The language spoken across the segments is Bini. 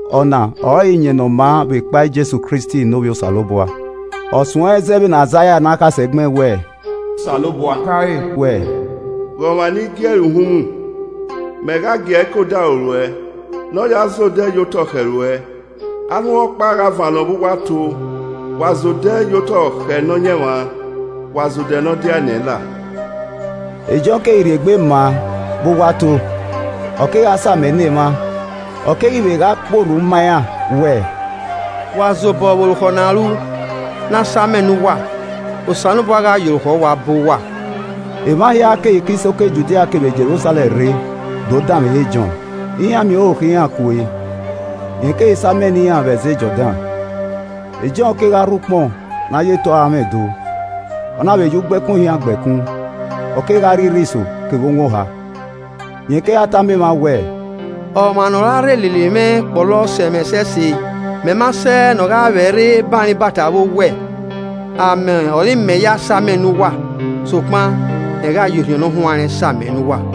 Ọna ọrọre Iyẹn Ne ọ maa vbekpa Jesu Kristi ne Ovbi Osanobua. Ọ suẹnrẹn zẹ vbene Aizaia ne akhasẹ gbẹn wẹẹ; “Osanobua khare wẹẹ, ‘Ghe ọmwa ne I gie ẹre uhunmwu, mẹ gha gi ẹe ke odaro ruẹ, ne ọ ya zẹ odẹ ye otọ khẹ ruẹ.’ Arhunmwu ọkpa gha vannọ vbe uwu ato: ‘Wa zẹ odẹ ye otọ khẹ Nọyaẹnmwa, wa zẹ odẹ ne ọ diae na ẹn la.’” E Jọn keghi rhie egbe ma vbe uwu ato, ọ kegha samẹ ne emwa, ọ keghi vbe gha kpe orhu ma iran wẹẹ, “Wa zobọ vbe orukhọ ne a ru. ne a samẹ ne uwa, Osanobua gha ya orukhọ uwa bọ uwa.” Emwa hia keghi ke isoko Judia kevbe ore Jerusalẹm rre dee do danmwehọ Jọn. Iran miẹn orukhọ iran kue, rẹn keghi samẹ ne iran vbe ẹzẹ Jọdan. E Jọn kegha rhuan ukpọn ne a ya eto aranmwẹ do, ọ na vbe ya ugbẹkun ohian gba ẹkun; ọ kegha rri irhiso kevbe owọn oha. Rẹn kegha tama emwa wẹẹ, “Ọmwa ne ọ ra rre lele mwẹ kpọlọ sẹ mwẹ ẹsẹse, mẹ ma sẹ ne ogha vbẹrre ban re ibata vbe owẹ. Amẹ ọre I mẹ ya samẹ ne uwa, sokpan rẹn gha ya Orhiọn Ne ọ huanrẹn samẹ ne uwa.”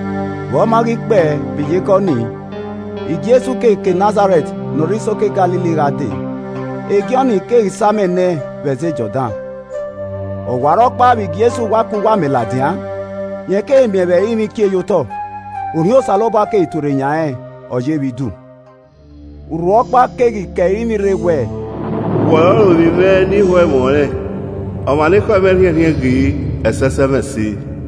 Vbe ọ ma ghi kpẹe, vbe iyekọni, Jesu keghi ke Nazarẹt ne ọ rre isoko Galili gha dee, Jọn keghi samẹ na ẹn vbe ẹzẹ Jọdan. Ọwarọkpa vbe Jesu wa ke uwu amẹ ladian, rẹn keghi miẹn vbe ẹrinmwi kie ye otọ, Orhiọn Osanobua keghi tuorre yan rẹn, ọ ye vbe idu. Urhu ọkpa keghi ke ẹrinmwi rre wẹẹ, “Wẹ ọrọre ovbi mwẹ ne I ho ẹmwẹ ọnrẹn, ọmwa ne ekhọe mwẹ rhiẹnrhiẹn ghe, ẹsẹsẹmwẹse.”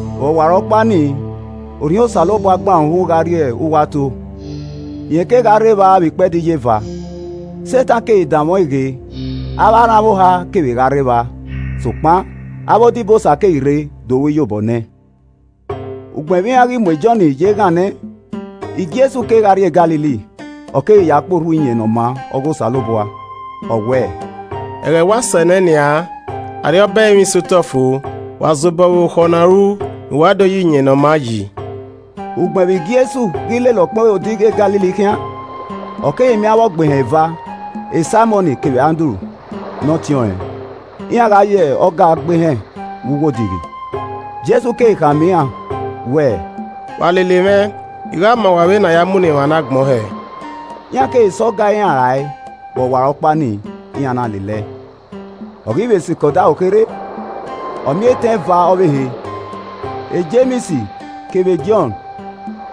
Vbe ọwarọkpa nii, Orhiọn Osanobua gban ẹre uhunmwu gha rrie uwu ato. Rẹn kegha rre evba vbe ikpẹdẹ iyeva, Setan keghi danmwẹ ọẹn ghe. Avbe aranmwẹ oha kevbe gha rre evba, sokpan avbe odibosa keghi rre do ru iyobọ ne ẹn. Ugbẹn vbe iran ghi mu Jọn ye eghan nẹ, Jesu kegha rrie Galili, ọ keghi ya kpe orhu Iyẹn Ne ọ maa ọghe Osanobua. Ọ wẹẹ, “Ẹghẹ wa sẹ nẹ nian, Arriọba Osanobua sẹ otọ fo! Wa zobọ vbe orukhọ ne a ru, ne uwa vbe do ya Iyẹn Ne ọ maa yi.” Ugbẹn vbe Jesu ghi lele ọkpẹn odighi e Galili khian, ọ keghi miẹn avbe ọgbehẹn eva, Saimọn kevbe Andru ne ọtẹn ọnrẹn, iran gha ya ọga gbe ehẹn vbe uwu odighi. Jesu keghi khama iran wẹẹ, “Wa lele mwẹ, I gha ma uwa vbene a ya munọ emwa ne agbọn hẹ.” Iran keghi sẹ ọga iran rae vbe ọwarọkpa nii, iran na lele ẹe. Ọ ghi vbe sikẹ odaro kherhe, ọ miẹn etẹn eva ọvbehe, Jems kevbe Jọn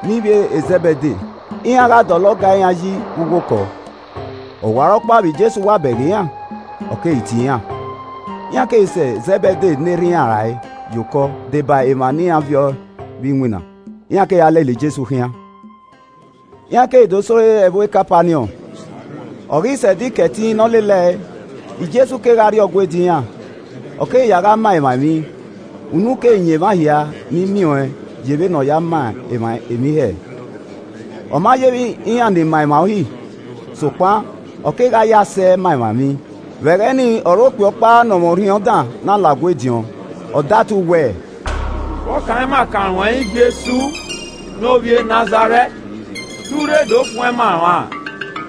ne ivbi e Zẹbede. Iran gha dọlọ ọga iran yi vbe uwu okọ. Ọwarọkpa vbe Jesu wa bẹghe iran, ọ keghi tie iran, iran keghi sẹ Zẹbede ne erha iran rae ye okọ deba emwa ne iran viọ vbe iwinna, iran keghi lele Jesu gha khian. Iran keghi do sẹ ore ẹvbo Kapaniọn, Ọ ghi sẹ Ẹdẹ Ikẹtin ne ọ lele ẹe, Jesu kegha rrie Ọgua ediọn iran, ọ keghi ya gha ma emwa emwi. Unu keghi yan emwa hia ni miẹn ọẹn ye vbene ọ ya ma emwa emwi hẹẹ, ọ ma yevbe iran ni ma emwa Uhi, sokpan ọ kegha ye asẹ ma emwa emwi. Vbe ẹghẹ ni ọre okpia ọkpa ne ọ mwẹ orhiọn dan na la Ọgua ediọn, ọ datu wẹẹ, “Vbọ kan ima kan ruẹn yi Jesu ne ovbi e Nazarẹt? Te u rre do fuẹn ima an ra?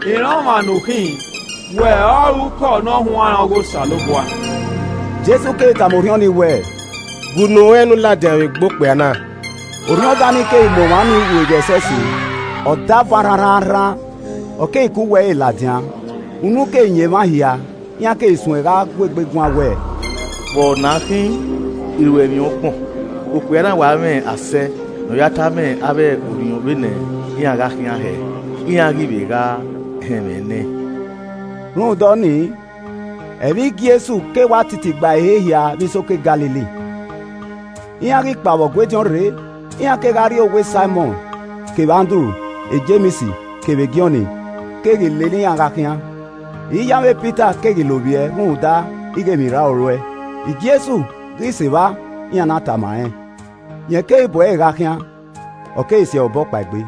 I rẹn ọmwa ne u khin: wẹ ọrọre ukọ ne ọ huanrẹn ọghe Osanobua.” Jesu keghi tama orhiọn nii wẹẹ, “Gue unu ruẹn ne u ladian vbe egbe okpia na.” Orhiọn dan ni keghi mu ọmwa ni rueghe ẹsẹse, ọ davan rhanrhananrhan, ọ keghi ke uwu ẹre ladian. Unu keghi yan emwa hia, iran keghi suẹn gha guegbe guan wẹẹ, “Vbe ọna khin? Iruẹmwi ọgbọn, okpia na wa mwẹ asẹ ne ọ ya tama avbe orhiọn vbene iran gha khian hẹ, iran ghi vbe gha họn ẹmwẹ nẹẹn.” Rhunmwuda ọnii, ẹmwẹ Jesu keghi wa titi gba ehe hia vbe isoko Galili. Iran ghi kpa vbe Ọgua ediọn rre, iran kegha rrie owa Saimọn kevbe Andru, Jems kevbe Jọn keghi lele iran gha khian. Iye amwẹ Pita keghi lovbiẹ rhunmwuda ighe emwirraro ruẹe. Jesu ghi sẹ evba, iran na tama rẹn. Rẹn keghi bu ẹre gha khian, ọ keghi si ẹre obọ kpaegbe.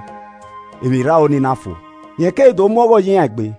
Emwirraro ni na fo. Rẹn keghi do mu ọghọ ye iran egbe.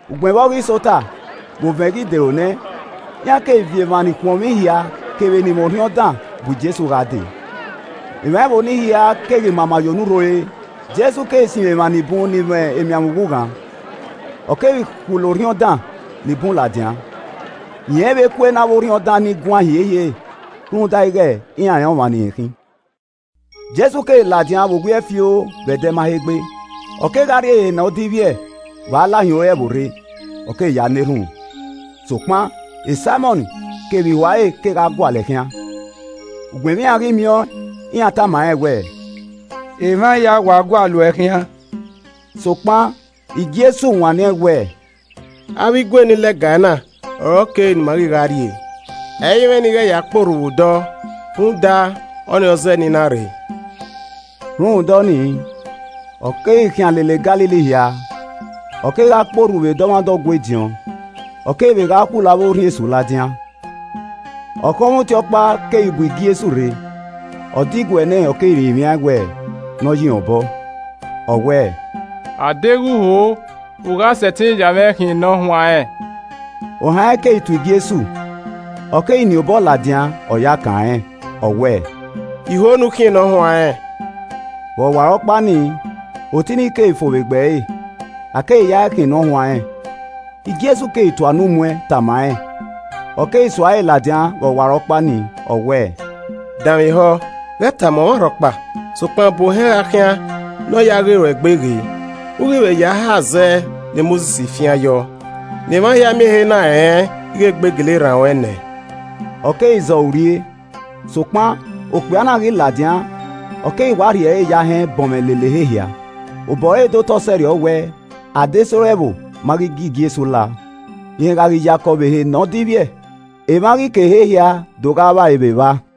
Ugbẹn vbe ọ ghi sẹ ota, vbe ovẹn ghi dero nẹ, iran keghi viọ emwa ni khuọnmwi hia kevbe ni mwẹ orhiọn dan bu Jesu gha dee. Emwa ẹvbo nii hia keghi mama ye onurho ore, Jesu keghi sinmwi emwa ni bun ni mwẹ emianmwẹ ughughan, ọ kevbe khulo orhiọn dan ni bun ladian. Rẹn i vbe kue ne avbe orhiọn dan ni guan hiehiere, rhunmwuda ighe iran rẹn ọmwa ne irẹn khin. Jesu keghi ladian vbe owiẹ fioo, vbe ẹdẹ ma he gbe, ọ kegha rrie ehe ne ọ divbiẹ vbe a la hin ore ẹvbo rre, ọ keghi ya na erhunmwu. Sokpan Saimọn kevbe ihua ẹre kegha gualọ ẹe khian. Ugbẹn vbe iran ghi miẹn ọẹn, iran tama rẹn wẹẹ, “Emwa hia wa gualọ uẹ khian.” Sokpan Jesu wanniẹn wẹẹ, “A vbe igue ni lẹga ena ọre ọ kere ne ima ghi gha rrie. Ẹ i mwẹ ne I ghẹ vbe ya kpe orhu vbe odọ rhunmwuda, ọnii ọre ọ zẹẹ ne I na rre.” Rhunmwuda ọnii, ọ keghi khian lele Galili hia, ọ kegha kpe orhu vbe dọmwadẹ Ọgua ediọn, ọ keghi vbe gha khulo avbe orhiọn esu ladian. Ọkhọnmwọ oti ọkpa keghi bu Jesu rre, ọ diguẹ nẹẹn ọ keghi rinmwian ẹn wẹ ne ọ ye irẹn obọ, ọ wẹẹ, “A deghẹ u ho, u gha sẹtin ya mwẹ khian ne ọ huanrẹn.” Ohan rẹn keghi to Jesu, ọ keghi nien obọ ladian, ọ ya ẹe kan rẹn, ọ wẹẹ, “I ho ne u khian ne ọ huanrẹn.” Vbe ọwarọkpa nii, oti ni keghi fo vbe egbe ẹre, a keghi ya ẹe khian ne ọ huanrẹn. Jesu keghi tua unu mu ẹn tama rẹn, ọ keghi rhie ẹre ladian vbe ọwarọkpa nii, ọ wẹẹ, “Danmwehọ, ghẹ tama ọmwa rhọkpa, sokpan bu ohẹn gha khian ne ọ ya ghe ruẹ egbe ghe. U ghi vbe ya hae azẹ ne Mosis fian yọ, ne emwa hia miẹn ehe na rẹn ighe egbe gele rran ruẹn nẹ.” Ọ keghi zẹ ọre urrie. Sokpan okpia na ghi ladian, ọ keghi wa rhie ẹre ye ahẹn bọnmwẹ lele ehe hia, obọ ọre de otọ sẹrriọ wẹẹ, adesẹ ore ẹvbo ma ghi gie Jesu lao. Rẹn gha ghi yakọ vbe ehe ne ọ divbiẹ, emwa ghi ke ehe hia do gha vba ẹre vbe evba.